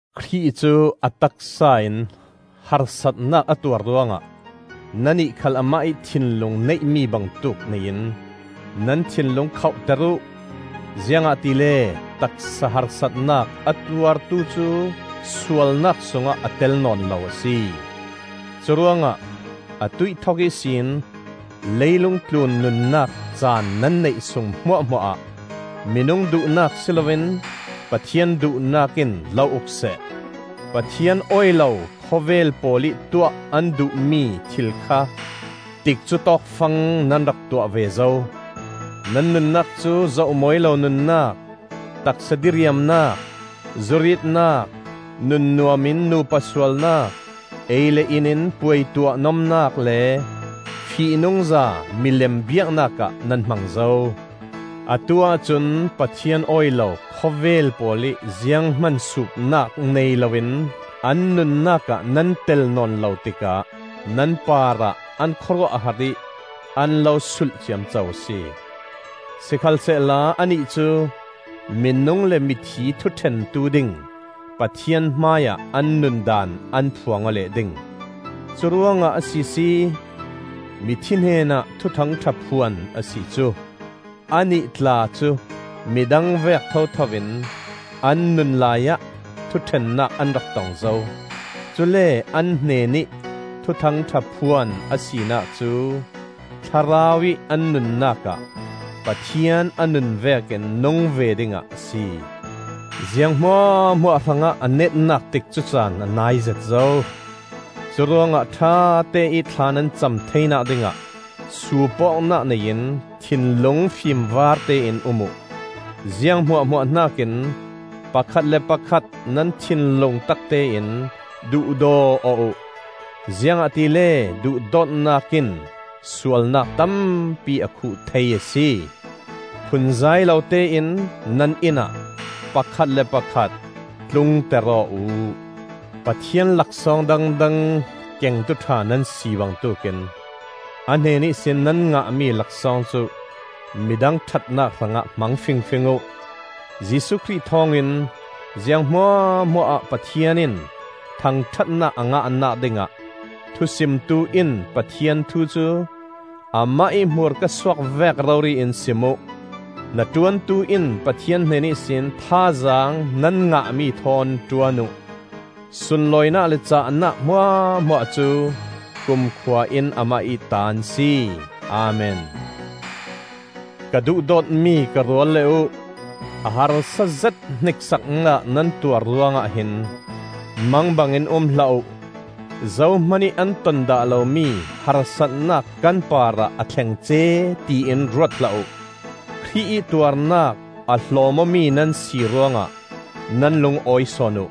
Khrih cu a taksa in harsatnak a tuar ruangah nannih khal amah ih thinlung neihmi bangtuk nei in nan thinlung khohter uh. Ziangahtile taksa harsatnak a tuartu cu sualnak sungah a tel nawn lo a si. Curuangah a tuih thok ihsin leilung tlun nunnak caan nan neih sung hmuahhmuahah minung duhnak si loin Pathian duhnak in lo uk seh. Pathian awi lo khawvel pawl ih tuah an duhmi thil kha tikcu tawk fang nan rak tuah ve zo. Nan nunnak cu zoh mawi lo nunnak, taksa diriamnak, zuritnak, nun nuamin nupa sualnak, ei le in in puaituah nomnak, le fihnungza milem biaknak ah nan hmang zo. Atu-ah cun Pathian awi lo khawvel pawl ih ziang hman suupnak nei loin an nunnak ah nan tel nawn lo tikah nan parah an khawruah a har ih an lo sulh ciamco a si. Sikhalsehla annih cu minung le mithi thuṭhentu ding Pathian hmaiah an nun daan an phuang aw leh ding. Curuangah a sisi mithi hnenah Thuthang ṭha phuan a si cu! Annih tla cu midang vek thothoin an nun laiah thuṭhennak an rak tong zo. Cule an hnenih Thuthang ṭha phuan a sinak cu thlarau ih an nunnak ah Pathian a nun vekin nung ve dingah a si. Ziang hmuahhmuah hrangah a netnak tikcu caan a naizet zo. Curuangah ṭhateih thla nan cam theinak dingah suup awknak nei in thinlung fimvartein um uh. Ziang hmuahhmuah hnakin pakhat le pakhat nan thinlung taktein duhdaw aw uh, ziangahtile duhdawtnak in sualnak tampi a khuh thei a si. Phunzai lotein nan innah pakhat le pakhat tlungter aw uh. Pathian laksawng dangdang kengtu ṭha nan si bangtuk in a hnen ihsin nan ngahmi laksawng cu midang ṭhatnak hrangah hmang fingfing uh. Jesuh Khrih thawngin ziang hmuahhmuah ah Pathian in thangṭhatnak a ngahnak dingah thusimtu in Pathian thu cu Amah ih hmurka suak vek rori in sim uh; hnaṭuantu in Pathian hnen ihsin thazaang nan ngahmi thawn ṭuan uh; sunlawinak le cahnak hmuahhmuah cu kumkhuain amah ih ta an si. Amen. Ka duhdawtmi ka rualle uh, a harsazet hniksaknak nan tuar ruangah hin mangbangin um hlah uh; zohman ih an ton dah lomi harsatnak kan parah a thlengce ti in ruat hlah uh. Khrih ih tuarnak a hlawm-awmi nan si ruangah nan lung awi sawn uh.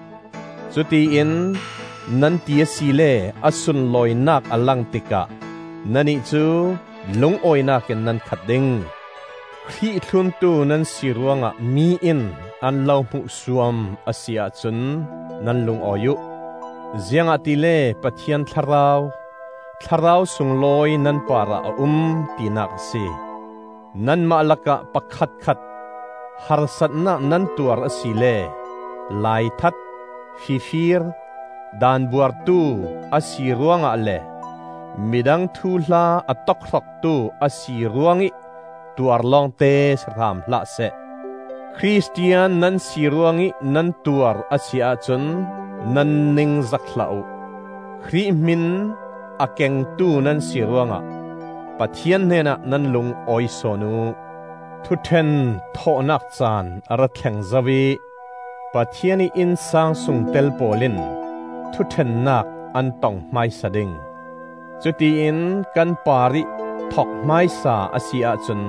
Cutiin nan ti asile a sunlawinak a lang tikah nannih cu lungawinak in nan khat ding. Khrih thluntu nan si ruangah mi in an lo hmuhsuam a si ahcun nan lungawi uh; ziangahtile Pathian Thlarau, Thlarau sunglawi nan parah a um tinak a si. Nanmah lakah pakhatkhat harsatnak nan tuar asile laithat, fifir, daan buartu a si ruangah le midang thuhla a tokhroktu a si ruangih tuar lawngte si hram hlah seh. Khristian nan si ruangih nan tuar a si ahcun nan ningzak hlah uh; Khrih hmin a kengtu nan si ruangah Pathian hnenah nan lung awi sawn uh. Thuṭhen thawhnak caan a ra thleng zo ih Pathian ih innsang sungtel pawl in thuṭhennak an tong hmaisa ding. Cutiin kan parih thok hmaisa a si ahcun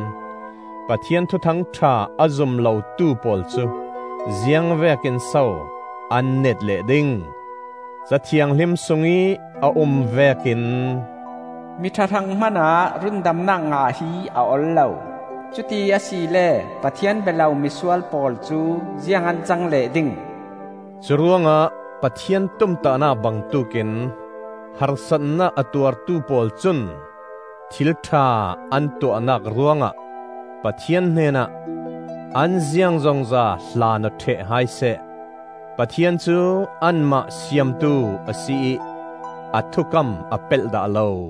Pathian Thuthangṭha a zum lotu pawl cu ziang vekin so an neet leh ding? Ca Thianghlim sungih a um vekin: “Miṭha hrang hmanah rundamnak ngah hi a ol lo; Cuti asile Pathian bia lo misual pawl cu ziang an cang leh ding?” Curuangah Pathian tumtahnak bangtuk in harsatnak a tuartu pawl cun thil ṭha an tuahnak ruangah Pathian hnenah an ziangzongza hlan aw ṭheh hai seh; Pathian cu anmah Siamtu a si ih a thukam a pelh dah lo.